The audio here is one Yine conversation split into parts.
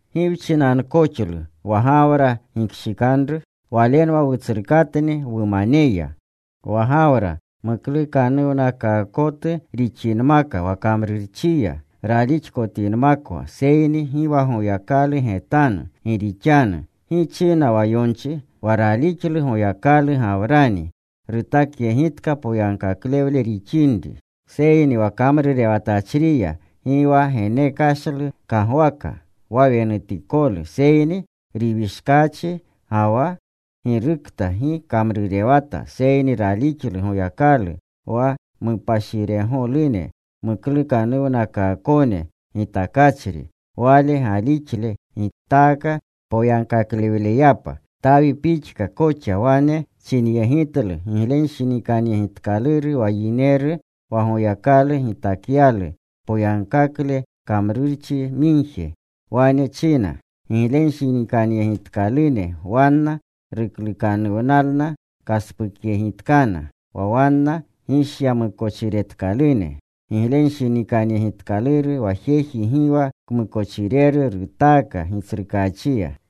¿Gi wchinankoxlu wa Gawra gikshikanru? Walenwa wutsrukatni wumaneya. Wa Gawra muklukanuwnakaakotu rixinmaka wa kamrurchiya, ralixkotinmakwa, seyni gi wa Goyakalu getanu. Gi rixanu ¿gi china wa yonchi? Wa ralixlu Goyakalu Gawrani. Rutakyegitka poyagkaklewle rixinri. Seyni wa kamrurewatachriya gi wa genekashlu kagwaaka wa wenutikolu, seyni riwishkaachi. Ga wa girukta gi kamrurewata seyni ralixlu Goyakalu wa mupashiregolune muklukanuwnakaakone gitakachri, wale galixle gitaaka poyagkakleyapa. Tawi pixka koxa wane chinyegitlu giglenshinikanyegitkaluru wa yineru wa Goyakalu gitakyalu poyagkakle kamrurchi migje. Wane china: Giglenshinikanyegitkalune wanna ruklukanuwnalna kaspukyegitkana, wa wanna gishyamukochiretkalune. Giglenshinikanyegitkaluru wa jeji gi wa kmukochireru rutaaka Gitsrukaachiya.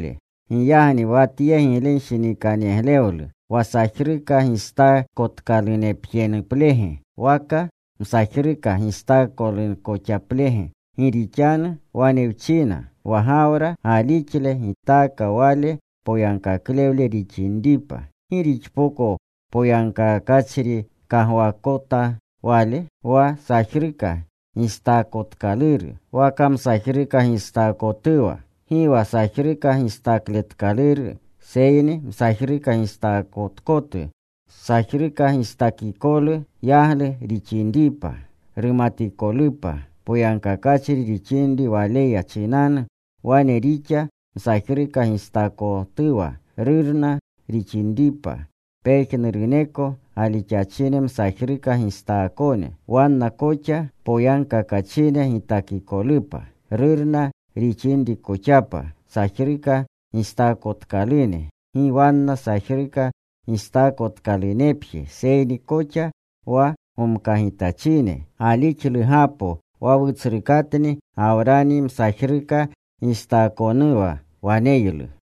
Giyagni wa tye giglenshinikanyeglewlu ¿wa sajruka gistaakotkalunepjenuplege? ¿Waka msajruka gistaakotkonkoxaplege? Gi rixanu wane wchina, wa Gawra galixle gitaaka wale poyagkakle rixinripa. ¿Gi rixpoko poyagkakachri kagwaakota wale? ¿wa sajruka gistaakotkaluru, waka msajruka gistaakotuwa? Gi wa sajruka gistakletkaluru, seyni msajruka gistaakotu. Sajruka gistaakikolu yaglu rixinripa, rumatikolupa poyagkakachri rixinri ralixleya chinanu. Wane rixa msajruka gistaakotuwa, rurna rixinripa pejnuruneko galixachine msajruka gistaakone, wanna koxa poyagkakachine gitakikolupa. Rurna rixinrikoxapa sajruka gistaakotkalune, gi wanna sajruka gistaakotkalunepje, seyni koxa wa gomkagitachine galixlugapo wa wutsrukatni Gawrani msajruka gistaakonuwa waneylu.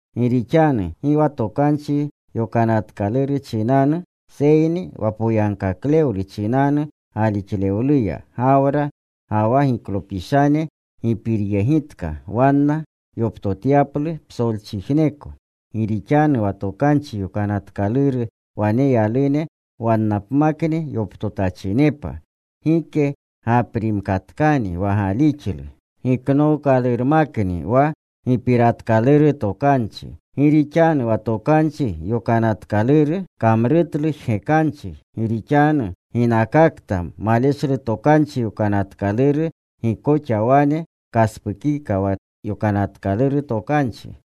Gi rixanu gi wa Tokanchi Yokanatkaluru chinanu, seyni wa poyagkaklewlu chinanu galixlewluya, Gawra ga wa giklopishane gipiryegitka wanna yoptotyaplu psolchijneko. Gi rixanu wa Tokanchi Yokanatkaluru waneyalune wannapmakni yoptotachinepa, gike gaprimkatkani wa galixlu; giknookalurmakni wa gipiratkaluru tokanchi. Gi rixanu wa Tokanchi Yokanatkaluru kamrutlu jgekanchi. Gi rixanu ginakakta maleshlu Tokanchi Yokanatkaluru, gi koxa wane kaspukika wa Yokanatkaluru Tokanchi.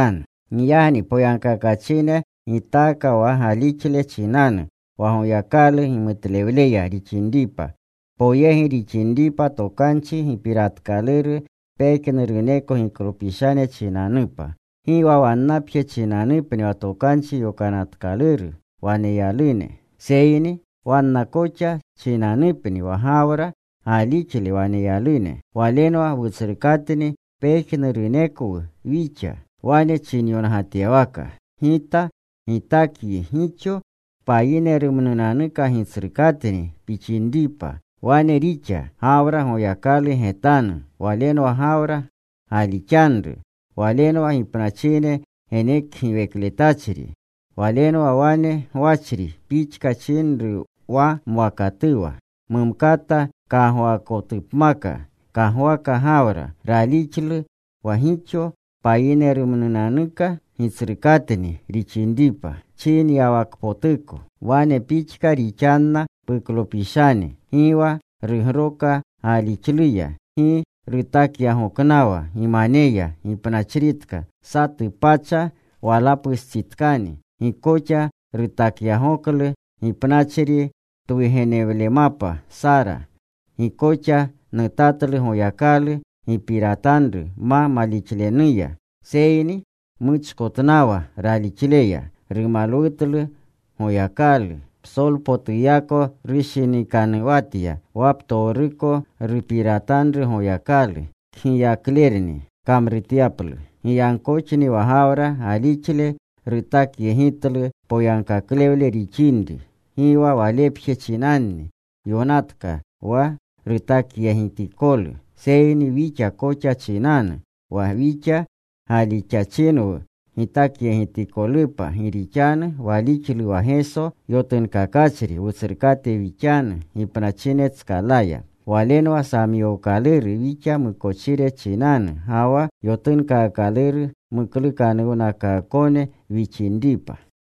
Giyagni poyagkakachine gitaaka wa galixle chinanu, wa Goyakalu gimutlewleya rixinripa, poyegi rixinripa tokanchi gipiratkaluru pejnuruneko giklopishane chinanupa, gi wa wannapje chinanupni wa Tokanchi Yokanatkaluru waneyalune, seyni wanna koxa chinanupni, wa Gawra galixle waneyalune. Walenwa wutsrukatni pejnurunekwu wixa. Wane chinyongatyawaka, Gita gitakyi gixo payinerumnunanuka gitsrukatni pixinripa. Wane rixa Gawra Goyakalu getanu. Walenwa Gawra galixanru. Walenwa gipnachine genekgiwekletachri. Walenwa wane gwachri pixka chinru wa mwakatuwa. Mumkata kagwaakotupmaka, kagwaka Gawra. Ralixlu wa gixo payinerumnunanuka gitsrukatni rixinripa, chinyawakpotuko: Wane pixka rixanna puklopishane. Gi wa rugroka galixluya. Gi rutakyagoknawa gimaneya gipnachritka. (Satu pacha walapustsitkani.) Gi koxa rutakyagoklu gipnachri twugenewlemapa Sara. Gi koxa nutatlu Goyakalu gipiratanru ma malixlenuya. Seyni muchkotnawa ralixleya. Rumalwutlu Goyakalu. Psolpotuyako rushinikanuwatya wa ptowruko rupiratanru Goyakalu, kgiyaklerni kamrutyaplu. Giyagkoxni wa Gawra galixle rutakyegitlu poyagkaklewle rixinri. Gi wa walepje chinanni yonatka wa rutakyegitikolu. Seyni wixa koxa chinanu, wa wixa galixachinwu gitakyegitikolupa, gi rixanu walixlu wa Geso yotunkakachri Wutsrukate wixanu gipnachinetskalaya. Walenwa samyookaluru wixa mukochire chinanu, ga wa yotunkaakaluru muklukanuwnakaakone wixinripa.